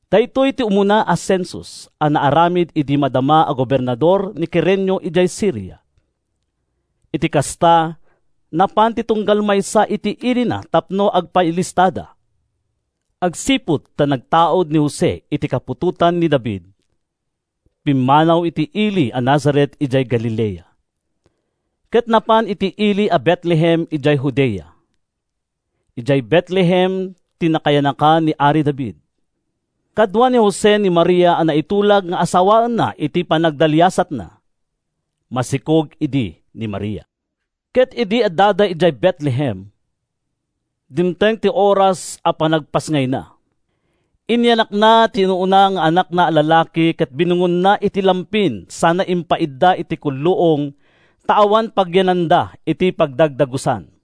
Daytoy ti umuna a sensus a naaramid idi madama a gobernador ni Kirenio idiay Siria. Iti kasta, napan ti tunggal maysa iti ilina tapno agpailistada. Agsipud ta nagtaud ni Jose iti kaputotan ni David, pimmanaw iti ili a Nazaret idiay Galilea, ket napan iti ili a Betlehem idiay Judea. Idiay Betlehem ti nakayanakan ni ari David. Kadua ni Jose ni Maria a naitulag nga asawaenna iti panagdaliasatna. Masikog idi ni Maria ket idi addada idiay Betlehem, dimteng ti oras a panagpasngayna. Inyanakna ti inauna nga anakna a lalaki ket binungonna iti lampin sana impaidda iti kulluong ta awan pagyananda iti pagdagdagusan.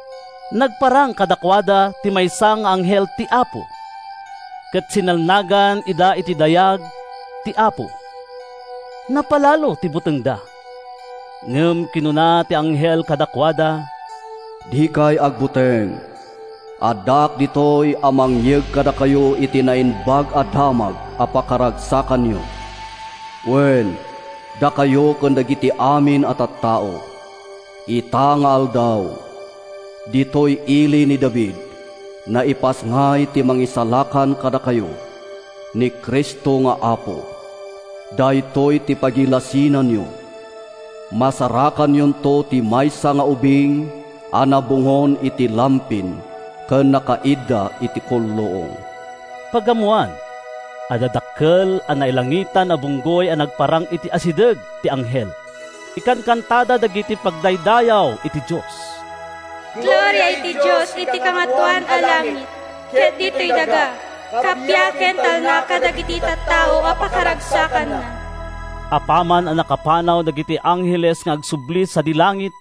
Nagparang kadakuada ti maysa nga anghel ti Apo, ket sinilnagan ida ti dayag ti Apo. Napalalo ti butengda, ngem kinuna ti anghel kadakuada, “Dikay agbuteng! Addaak ditoy a mangyeg kadakayo iti naimbag a damag a pakaragsakanyo, wen, dakayo ken dagiti amin a tattao. Ita nga aldaw, ditoy ili ni David, naipasngay ti mangisalakan kadakayo—ni Cristo nga Apo! Daytoy ti pagilasinanyo: masarakanyonto ti maysa nga ubing a nabungon iti lampin ken nakaidda iti kulluong.” Pagammoan, adda dakkel a nailangitan a bunggoy a nagparang iti asideg ti anghel. Ikankantada dagiti pagdaydayaw iti Dios: “Gloria iti Dios iti kangatoan a langit! Ket ditoy daga, kappia ken talna kadagiti tattao a pakaragsakanna!” Apaman a nakapanaw dagiti angheles nga agsubli sadi langit,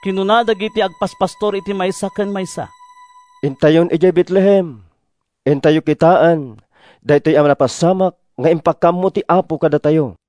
kinuna dagiti agpaspastor iti maysa ken maysa, “Intayon idiay Betlehem! Intayo kitaen daytoy napasamak nga impakaammo ti Apo kadatayo!”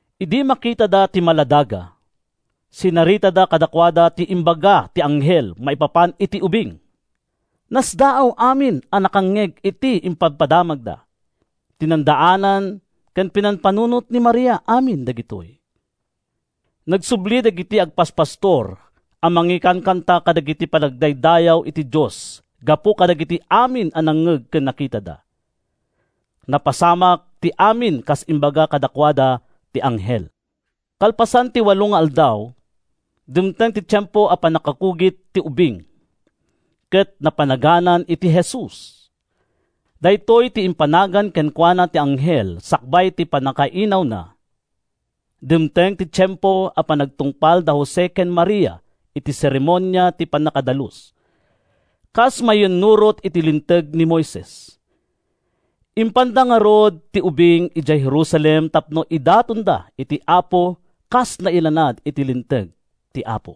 Idi makitada ti maladaga, sinaritada kadakuada ti imbaga ti anghel maipapan iti ubing. Nasdaaw amin a nakangngeg iti impadamagda. Tinandaanan ken pinampanunot ni Maria amin dagitoy. Nagsubli dagiti agpaspastor a mangikankanta kadagiti pagdaydayaw iti Dios gapu kadagiti amin a nangngeg ken nakitada. Napasamak ti amin kas imbaga kadakuada ti anghel. Kalpasan ti walo nga aldaw, dimteng ti tiempo a pannakakugit ti ubing, ket napanaganan iti Jesus. Daytoy ti impanagan kenkuana ti anghel sakbay ti pannakainawna. Dimteng ti tiempo a panangtungpal da Jose ken Maria iti seremonia ti pannakadalus, kas mayannurot iti Linteg ni Moises. Impanda ngarud ti ubing idiay Jerusalem tapno idatonda iti Apo kas nailanad iti linteg ti Apo: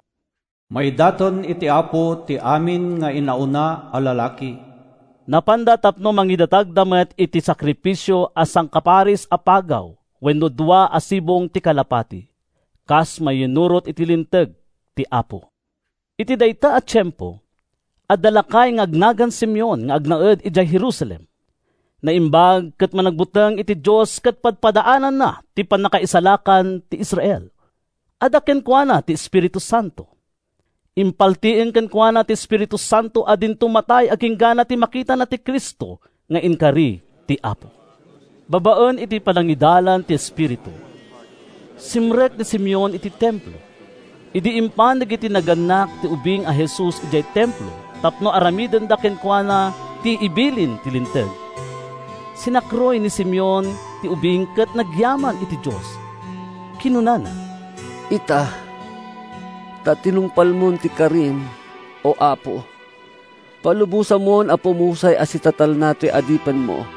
“Maidaton iti Apo ti amin nga inauna a lalaki.” Napanda tapno mangidatagda met iti sakrifisio a sangaparis a pagaw wenno dua a sibong ti kalapati, kas mayannurot iti linteg ti Apo. Iti dayta a tiempo, adda lakay nga agnagan Simeon nga agnaed idiay Jerusalem. Naimbag ken managbuteng iti Dios ket padpadaananna ti pannakaisalakan ti Israel. Adda kenkuana ti Espiritu Santo. Impaltiing kenkuana ti Espiritu Santo a dinto matay agingga iti makitana ti Cristo nga inkari ti Apo. Babaen iti panangidalan ti Espiritu, simrek ni Simeon iti Templo. Idi impan dagiti nagannak ti ubing a Jesus idiay Templo tapno aramidenda kenkuana ti ibilin ti Linteg, sinakruy ni Simeon ti ubing ket nagyaman iti Dios. Kinunana: “Ita, ta tinungpalmon ti karim, O Apo, Palubosamon a pumusay a sitatalna toy adipenmo.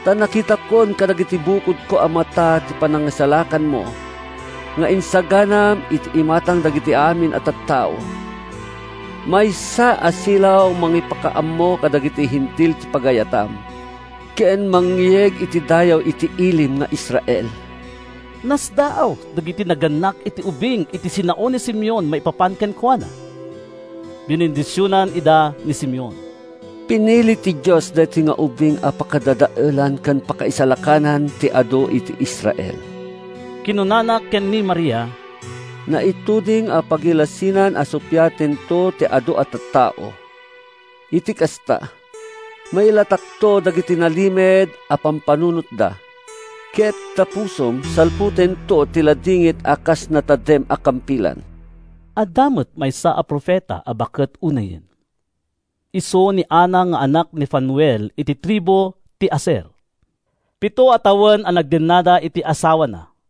Ta nakitakon kadagiti bukodko a mata ti panangisalakanmo, Nga insaganam iti imatang dagiti amin a tattao: Maysa a silaw a mangipakaammo kadagiti Hentil ti pagayatam. Ken mangyeg iti dayaw iti ilim nga Israel.” Nasdaaw dagiti nagannak iti ubing iti sinao ni Simeon maipapan kenkuana. Binendisionan ida ni Simeon. “Pinili ti Dios daytoy nga ubing a pakadadaelan ken pakaisalakanan ti adu iti Israel,” kinunana ken ni Maria. “Naituding a pagilasinan a suppiatento ti adu a tattao. Iti kasta, mailatakto dagiti nalimed a pampanunotda. Ket ta pusom salputento ti ladingit a kas natadem a kampilan.” Adda met maysa a profeta a baket unayen. Isu ni Ana nga anak ni Fanuel iti tribu ti Aser. Pito a tawen a nagdennada iti asawana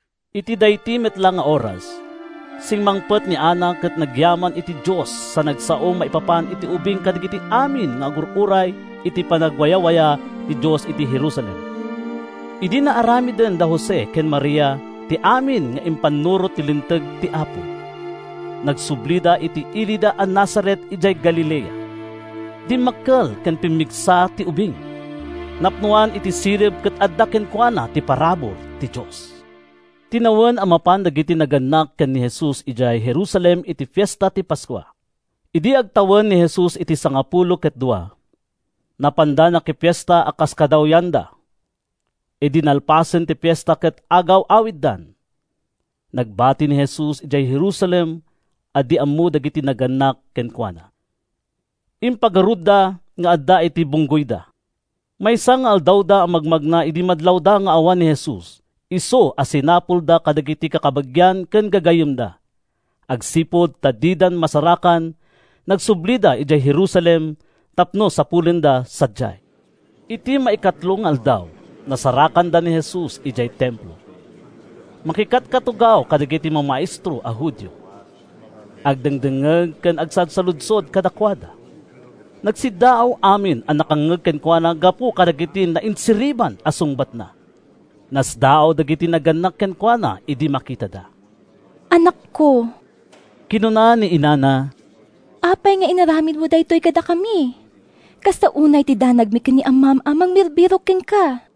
Iti daydi met la nga oras, simmangpet ni Ana ket nagyaman iti Dios sa nagsao maipapan iti ubing kadagiti amin nga agur-uray iti panangwayawaya ti Dios iti Jerusalem. Idi naaramiden da Jose ken Maria ti amin nga ipaannurot ti linteg ti Apo, nagsublida iti ilida a Nazaret idiay Galilea. Dimmakkel ken pimmigsa ti ubing. Napnoan iti sirib ket adda kenkuana ti parabur ti Dios. Tinawen a mapan dagiti nagannak ken ni Jesus idiay Jerusalem iti Fiesta ti Paskua. Idi agtawen ni Jesus iti sangapulo ket dua, napanda nakifiesta a kas kadawyanda. Idi nalpasen ti fiesta ket agaw-awiddan, nagbati ni Jesus idiay Jerusalem a di ammo dagiti nagannak kenkuana. Impagarupda nga adda iti bunggoyda. Maysa nga aldawda a magmagna idi madlawda nga awan ni Jesus, isu a sinapsapulda kadagiti kakabagian ken gagayyemda. Agsipud ta dida masarakan, nagsublida idiay Jerusalem tapno sapulenda sadiay. Iti maikatlo nga aldaw, nasarakanda ni Jesus idiay Templo. Makikatkatugaw kadagiti mamaestro a Judio. Agdengdengngeg ken agsalsaludsod kadakuada. Nagsiddaaw amin a nakangngeg kenkuana gapu kadagiti nainsiriban a sungbatna. Nasdaaw dagiti nagannak kenkuana idi makitada. “Anakko,” kinuna ni inana, “apay nga inaramidmo daytoy kadakami? Kasta unay ti danagmi ken ni amam a mangbirbirok kenka.”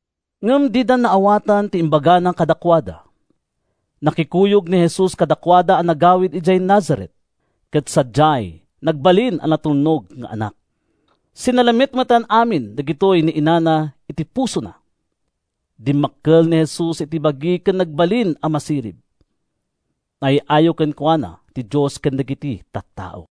Ngem dida naawatan ti imbagana kadakuada. Nakikuyog ni Jesus kadakuada a nagawid idiay Nazaret, ket sadiay, nagbalin a natulnog nga anak. Sinalimetmetan amin dagitoy ni inana iti pusona. Dimmakkel ni Jesus iti bagi ken nagbalin a masirib. Naay-ayo kenkuana ti Dios ken dagiti tattao.